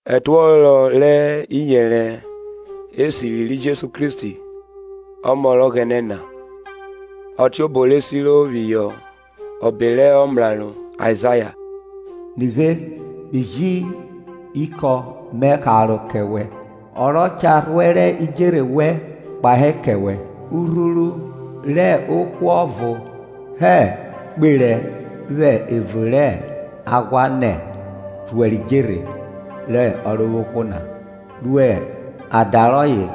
Ẹtuọhọ rẹ iyẹnrẹ esiri ri Jesu Kristi, Ọmọ rẹ Ọghẹnẹ na; Ọtiobo re siro phihọ ọbe rẹ ọmraro Aizaya, Nighe, Mi ji ikọn mẹ karo kẹ wẹ, Ọ rọ cha rhuẹrẹ idjerhe wẹn kpahe kẹ wẹ; Urhuru rẹ ohwo ovọ herọ kperẹ vwẹ evun rẹ aghwa nẹ Rhuẹrẹ idjerhe rẹ Ọrovwohwo na, ru ada rọye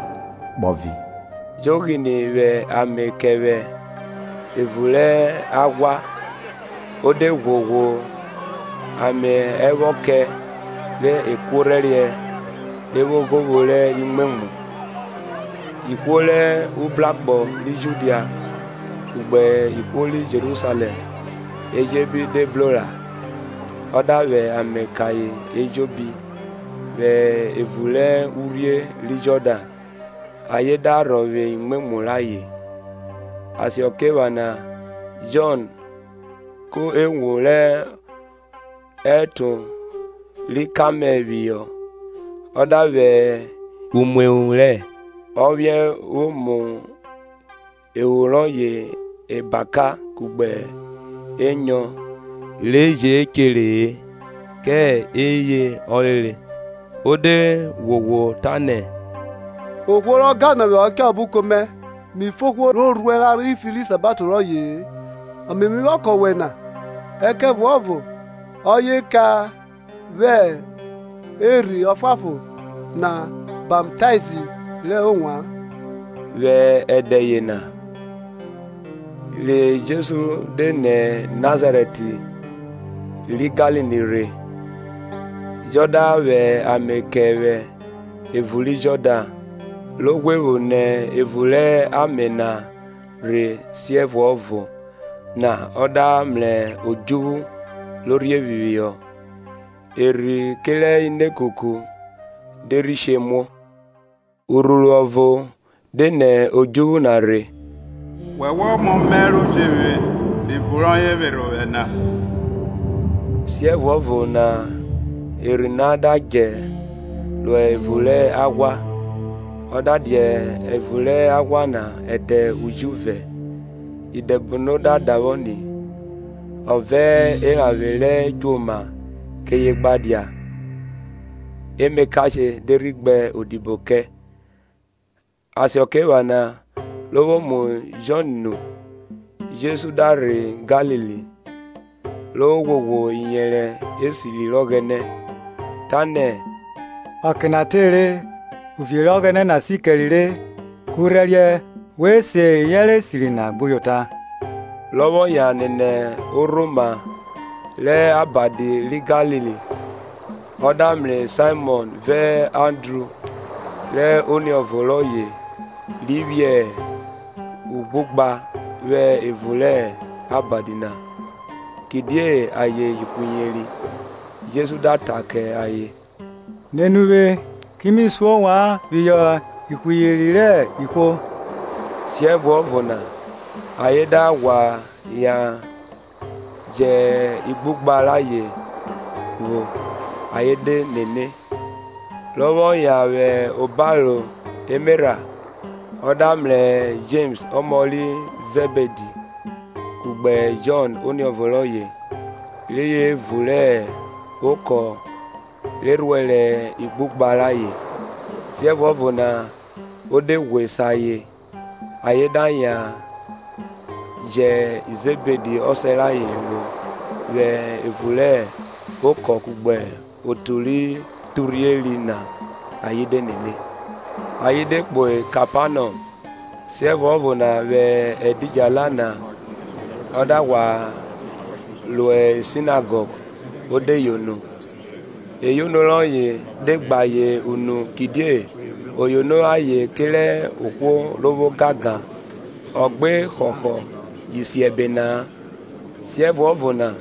kpọvi; Jọn ghine vwẹ ame kẹ vwẹ evun rẹ aghwa o de ghwoghwo ame ẹvwọkẹ rẹ ekuorhẹriẹ re evwoghovwo rẹ imwemwu. Ihwo rẹ ubrakpọ ri Judia, kugbe ihwo ri Jerusalẹm ejobi de bro ra; ọ da vwẹ ame kẹ ayen ejobi vwẹ evun rẹ urhie ri Jọdan ayen da rhọvwe imwemwu rayen. Asakiephana Jọn ku ewun rẹ ẹtọn ri kamẹl phihọ Ọ da vwẹ umuehun rẹ ophiẹn vwo mu ehun rọye ebaka kugbe enyọn re je chere kẹ eye ọ re re. O de ghwoghwo ta nẹ, Ohwo rọ gan nọ ovwẹ cha vwẹ obuko mẹ, mi fo ohwo rọ rhuẹn ra rhan ifi rẹ isabato rọye-e. Ame me vwọ kẹ wẹ na; ẹkẹvuọvo ọye cha vwẹ Erhi Ọfuanfon na baptaizi rẹ ovwan. Vwẹ ẹdẹ yena rẹ Jesu de nẹ Nazarẹt ri Galili rhe, Jọn da vwẹ ame kẹ vwẹ evun ri Jọdan. Ro ghwe vwo nẹ evun rẹ ame na rhe siẹvuọvo na ọ da mrẹ odjuvwu ro rhie phihọ, Erhi kerẹ inekuku de rhi she muo; Urhuru ọvo de nẹ odjuvwu na rhe, Wọwẹ hẹ Ọmọ Mẹ ro jevwe rẹ ivun rọye vwerhe ovwẹ na. Siẹvuọvo na Erhi na da djẹ ro evun rẹ aghwa. Ọ da dia evun rẹ aghwa na ẹdẹ ujuvẹ, Idẹbono da davwọ ni; ọ vẹ eranvwe rẹ djoma keye gba dia, emakashe de rhi gbe odibo kẹ. Asakiephana re vwo mu Jọn nu, Jesu da rhe Galili, ro ghwoghwo iyẹnrẹ esiri rẹ Ọghẹnẹ, tanẹ, ọke na tere, uvie rẹ Ọghẹnẹ na sikẹre re, kurhẹriẹ we se iyẹnrẹ esiri na gbuyota. Rọ vwọ yan nene orhoma rẹ Abadi ri Galili, o da mrẹ Saimọn vẹ Andru rẹ oniọvo rọye ri phiẹ ughugha vwẹ evun rẹ abadi na, kidie ayen ihwiyeri. Jesu da ta kẹ ayen, Nene uvwe, kimi su ovwan phihọ ihwiyeri rẹ ihwo. Siẹvuọvo na ayen da ghwa yan jẹ ighugha rayẹn vwo ayen de nene. Rọ vwọ yan hẹ obaro emerha, ọ da mrẹ Jems ọmọ ri Zẹbidi kugbe Jọn oniọvo rọye re hẹ evun rẹ okọ re rhuẹrẹ ighugha rayen. Siẹvuọvo na o de ghwe se ayen; ayen da yan jẹ Zẹbidi ọsẹ rayẹn vwo vwẹ evun rẹ okọ kugbe otu ro durhieri na ayen de nene. Ayen de kpo Kepanọm; siẹvuọvo na vwẹ ẹdidjala na ọ da ghwa ro sinagọg o de yono. Eyono rọye de gbe ayen unu kidie o yono ayen kerẹ ohwo ro vwo ogangan, ọ gbe họhọ Isiẹbe na-a. Siẹvuọvo na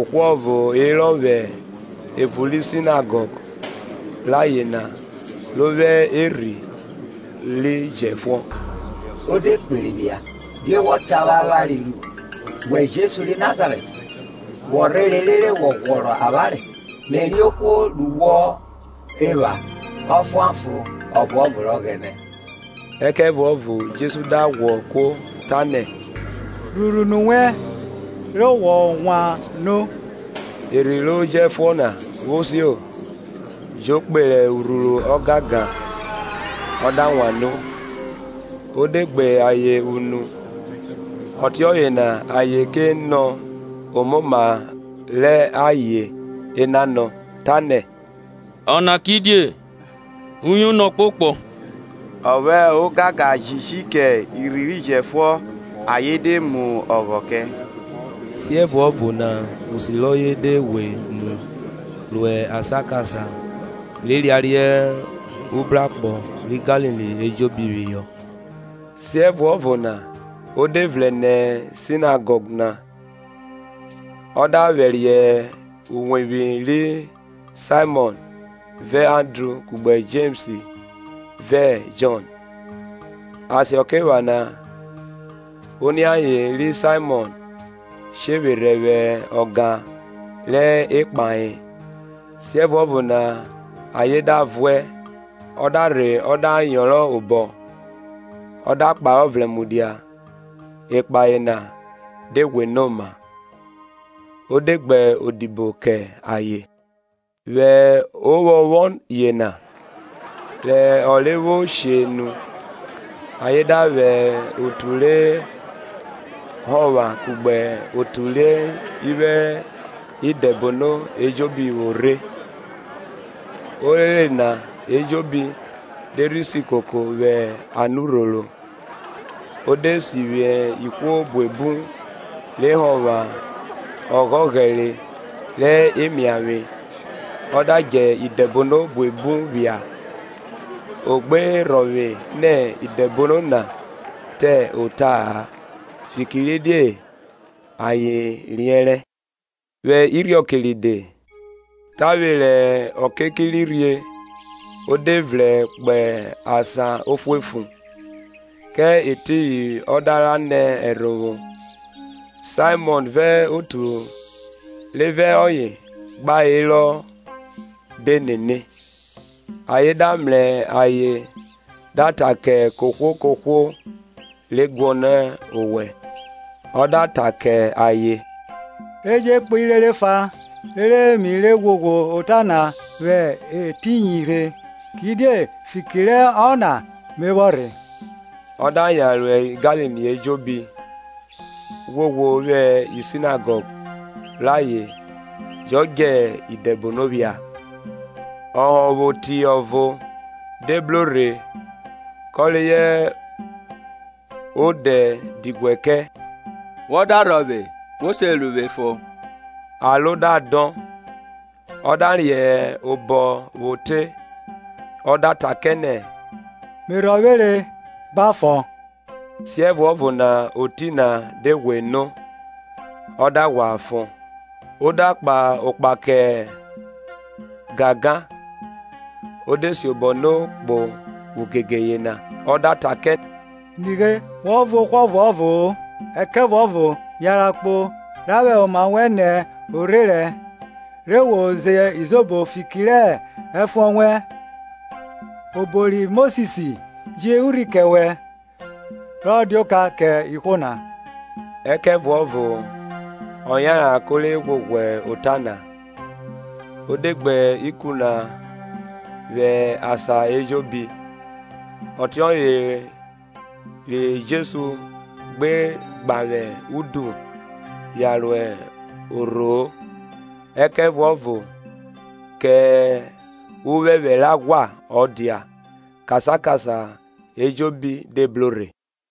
ohwo ọvo herọ vwẹ evun ri Sinagọg rayen na ro vwo erhi ro jẹfuọn; O de kperi phia, die wọ cha vwẹ avwanre ru, wẹ Jesu ri Nazarẹt? Wọ rhere rhe ghwọrọ avwanre? Me riẹn ohwo ru wọ epha Ọfuanfon ọvuọvo rẹ Ọghẹnẹ. Ẹkẹvuọvo Jesu da ghwo kuo tanẹ; Rhurhu unu wẹn, re wọ wan no. Erhi ro jẹfuọn na vwo sio, jo kperẹ urhuru ọgangan, ọ da wan no. O de gbe ayen unu, ọtiọye na ayen ke nọ omoma rẹ ayen enanọ, tanẹ,. Ọna kidie? Uyono ọkpokpọ Ọ vwẹ ogangan jiji kẹ irhi ri jẹfuọn, ayen de mu ọghọ kẹ. Siẹvuọvo na usi rọye de ghwe mu ro asan kasan re yariẹ ubrakpọ ri Galili ejobi phihọ. Siẹvuọvo na o de vrẹn nẹ Sinagọg na, ọ da vwẹriẹ uwevwi ri Saimọn vẹ Andru kugbe Jems vẹ Jọn. Asakiephana oniaye ri Saimọn shevwerhẹ vwẹ ọga rẹ ekpahe; siẹvuọvo na ayen da vuẹ. Ọ da rhe ọ da yọnrọn obọ, ọ da kparọ vrẹn mudia; ẹkpahẹ na de ghwe no oma; o de gbe odibo kẹ ayen. Vwẹ ovwọnvwọn yena, rẹ ọnre vwo she nu, ayen da vwẹ otu rẹ họvwan kugbe otu ri vwo idẹbono ejobi vwọ rhe. Orere na ejobi de rhi si koko vwẹ anurhoro. O de sivwi ihwo buebu re họvwan oghoghẹre rẹ emiavwe ọ da djẹ idẹbono buebu phia; ọ gbe rhọvwe nẹ idẹbono na ta ota-a, fikiridie ayen riẹnrẹ. Vwẹ irhiọke ride, tavwe rẹ ọke ki ri rhie o de vrẹn kpo asan ofuefu ofuefu, kẹ etiyin ọ da ra nẹ ẹrhovwo. Saimọn vẹ otu re vẹ ọye gba hẹrọ de nene. ayen da mrẹ ayen da ta kẹ kohwo kohwo ra guọnọ owẹ. Ọ da ta kẹ ayen, E je kpo irere ẹfa, rere mi re ghwoghwo ota na vwẹ etiyin rhe; kidie fiki rẹ ọna mẹ vwọ rhe. ọ da yan ro Galili ejobi, ghwoghwo vwi Sinagọg rayen jọ djẹ idẹbono phia. Ọhọnvwoti ọvo de bro rhe kọ rẹ o de diguẹ kẹ, Wọ da rhọvwe wo se ru vwe fon. Aro da dọn, ọ da riẹn obọ vwo te, ọ da ta kẹ nẹ, mẹ rhọvwere; gba fon. Siẹvuọvo na oti na de ghwe no, ọ da ghwa fon. O da kpa okpa kẹ gangan, o de siobọ no kpo ugege yena. Ọ da ta kẹ nighe wọ vuẹ ohwo ọvuọvo-o; ẹkẹvuọvo yanran kpo ra vwẹ oma wẹn nẹ orherẹn, re wo zẹ izobo fiki rẹ ẹfuọn wẹn, obo ri Mosis ji urhi kẹ wẹ, rọ dia oka kẹ ihwo na. Ẹkẹvuọvo ọ yanran ko re ghwoghwo ota na, o de gbe ikun na wan asan ejobi, ọtiọye re Jesu gbe gbavwe udu yan ro orho-o, ẹkẹvuọvo kẹ uphẹphẹ rẹ aghwa ọ dia, kasan kasan ejobi de bro rhe.